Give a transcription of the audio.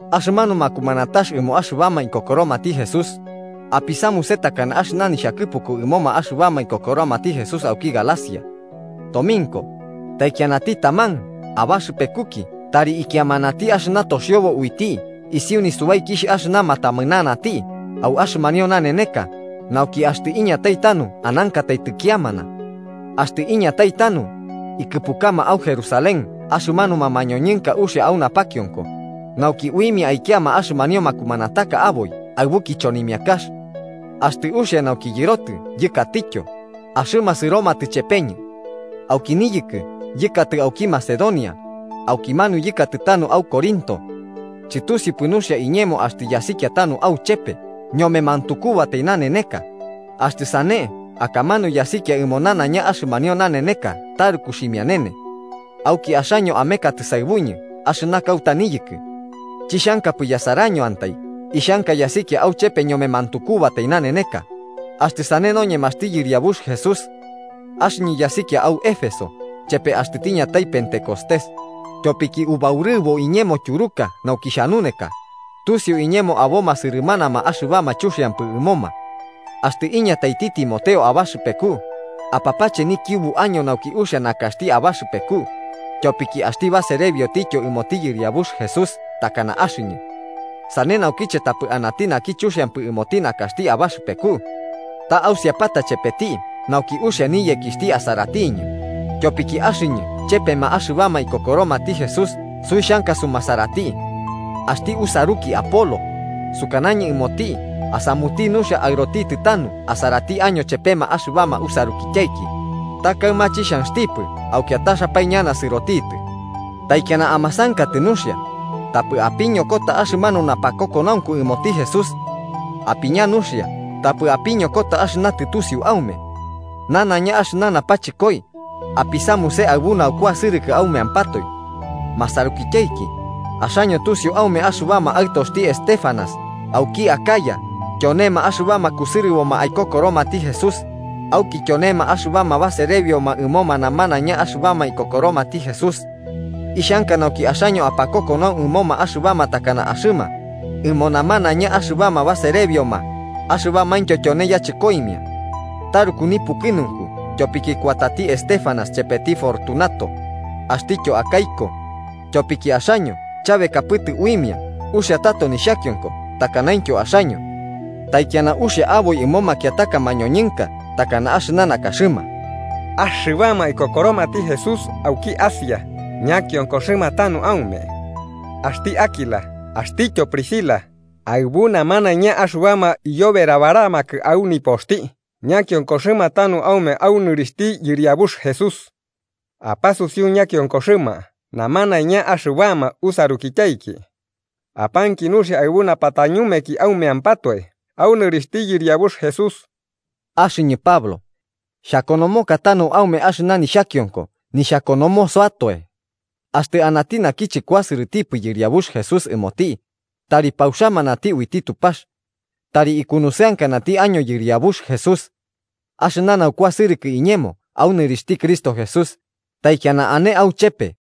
Axɨna makumanatax ɨmo axɨbama ikokoromati Jesús, apisamuse takana axɨna nixhakɨpuku ɨmoma axɨbama ikokoromati Jesús auki Galacia. Tominko, taikianati taman abaxɨpekuki tari ikiamanati axɨna toxiobo uiti isiu nisubaiki axɨna matamɨnanati au axɨmanio naneneka nauki axtɨ iñatai tanu anankatai tɨkiamana. Axtɨ iñatai tanu, ikɨpukama au Jerusalén axɨmanuma mañoñɨnka uxia au napakionko, nauki uimia aikiama axɨmanio makumanataka aboi aɨbu kichonimiakax. Axtɨ uxia nauki yɨrotɨ yɨkatityo, axɨma sɨromatɨ chepeñɨ. Auki niyɨkɨ yɨkatɨ auki Macedonia, aukimanu yɨkatɨ tanu au Corinto. Chɨtusiupɨ nuxia iñemo axtɨ yasikia tanu auchepe ñome mantukubatai naneneka, axtɨ sane akamanu yasikia ɨmo nanaiña axɨmanio naneneka taruku ximianene. Auki axaño amekatɨ saɨbuñɨ axɨna kauta niyɨkɨ. Chixhankapɨ yasarañoantai ixhanka yasikia auchepe ñome mantukubatai naneneka, axtɨ sane noñemaxti Yɨriabux Jesús. Axɨñɨ yasikia au Éfeso chepe axtɨ tiñatai Pentecostés, tyopiki ubaurɨbo iñemo tyuruka nauki xhanuneka, tusiu iñemo aboma sɨrɨmanama axɨbama chuxiampɨ ɨmoma. Axtɨ iñataiti Timoteo abaxɨpeku, apapache nikiubu año nauki uxia nakaxti abaxɨpeku, tyopiki axti baserebiotityo ɨmoti Yɨriabux Jesús takana axɨñɨ. Sane naukiche tapɨ anati naki chuxiampɨ ɨmoti nakaxti abaxɨpeku. Ta ausiapata chepeti nauki uxia niyekixhti asaratiñɨ, tyopiki axɨñɨ chepema axɨbama ikokoromati Jesús suixhanka sumasarati. Axti usaruki Apolo, sukanañɨ ɨmoti asamuti nuxia aɨrotitɨ tanu asarati año chepema axɨbama usarukityaiki, ta kaɨma chixhanxtipɨ au kiataxapae ñana sɨrotitɨ. Taikiana amasankatɨ nuxia, tapɨ apiñokota axɨna napakokonaunku ɨmoti Jesús. Apiña nuxia tapɨ apiñokota axɨna tɨtusiu aume. Nanaiña axɨna napachɨkoi apisamuse aɨbu naukuasɨrɨkɨ aumeampatoe. Masarukityaiki, axaño tusiu aume axɨbama aɨtoxti Estéfanas auki Acaya tyonema axɨbama kusɨrɨboma aikokoromati Jesús, auki tyonema axɨbama baserebioma ɨmoma namanaiña axɨbama ikokoromati Jesús. Ixhanka nauki axaño apakokonau ɨmoma axɨbama takana axɨma, ɨmo namanaiña axɨbama baserebioma axɨbamaintyo tyone yachɨkoimia. Taruku nipukɨnunku tyopiki kuatati Estéfanas, chepeti Fortunato axtityo Acaico, tyopiki axaño chabekapɨtɨ uimia uxia tato nixhakionko, takanaintyo axaño. Taikiana uxia aboi ɨmo makiataka mañoñɨnka takana axɨna nakaxɨma. Axɨbama ikokoromati Jesús auki Asia ñakionkoxɨma tanu aume. Axti Áquila axtityo Priscila aɨbu namanaiña axɨbama iyoberabaramakɨ au nipoxti ñakionkoxɨma tanu aume au nɨrixhti Yɨriabux Jesús. Apasusiu ñakionkoxɨma namanaiña axɨbama usarukityaiki. Apanki nuxia aɨbu napatañumeki aumeampatoe au nɨrixhti Yɨriabux Jesús. Axɨñɨ, Pablo, xhakonomoka tanu aume axɨna nixhakionko nixhakonomosoatoe. Axtɨ anati naki chɨkuasɨrɨtipɨ Yɨriabux Jesús ɨmoti, ¡tari pauxamanati uiti Tupax! Tari ikunusɨankanati año Yɨriabux Jesús. Axɨna naukuasɨrɨkɨ iñemo au nɨrixhti Cristo Jesús, taikiana ane auchepe, Amén.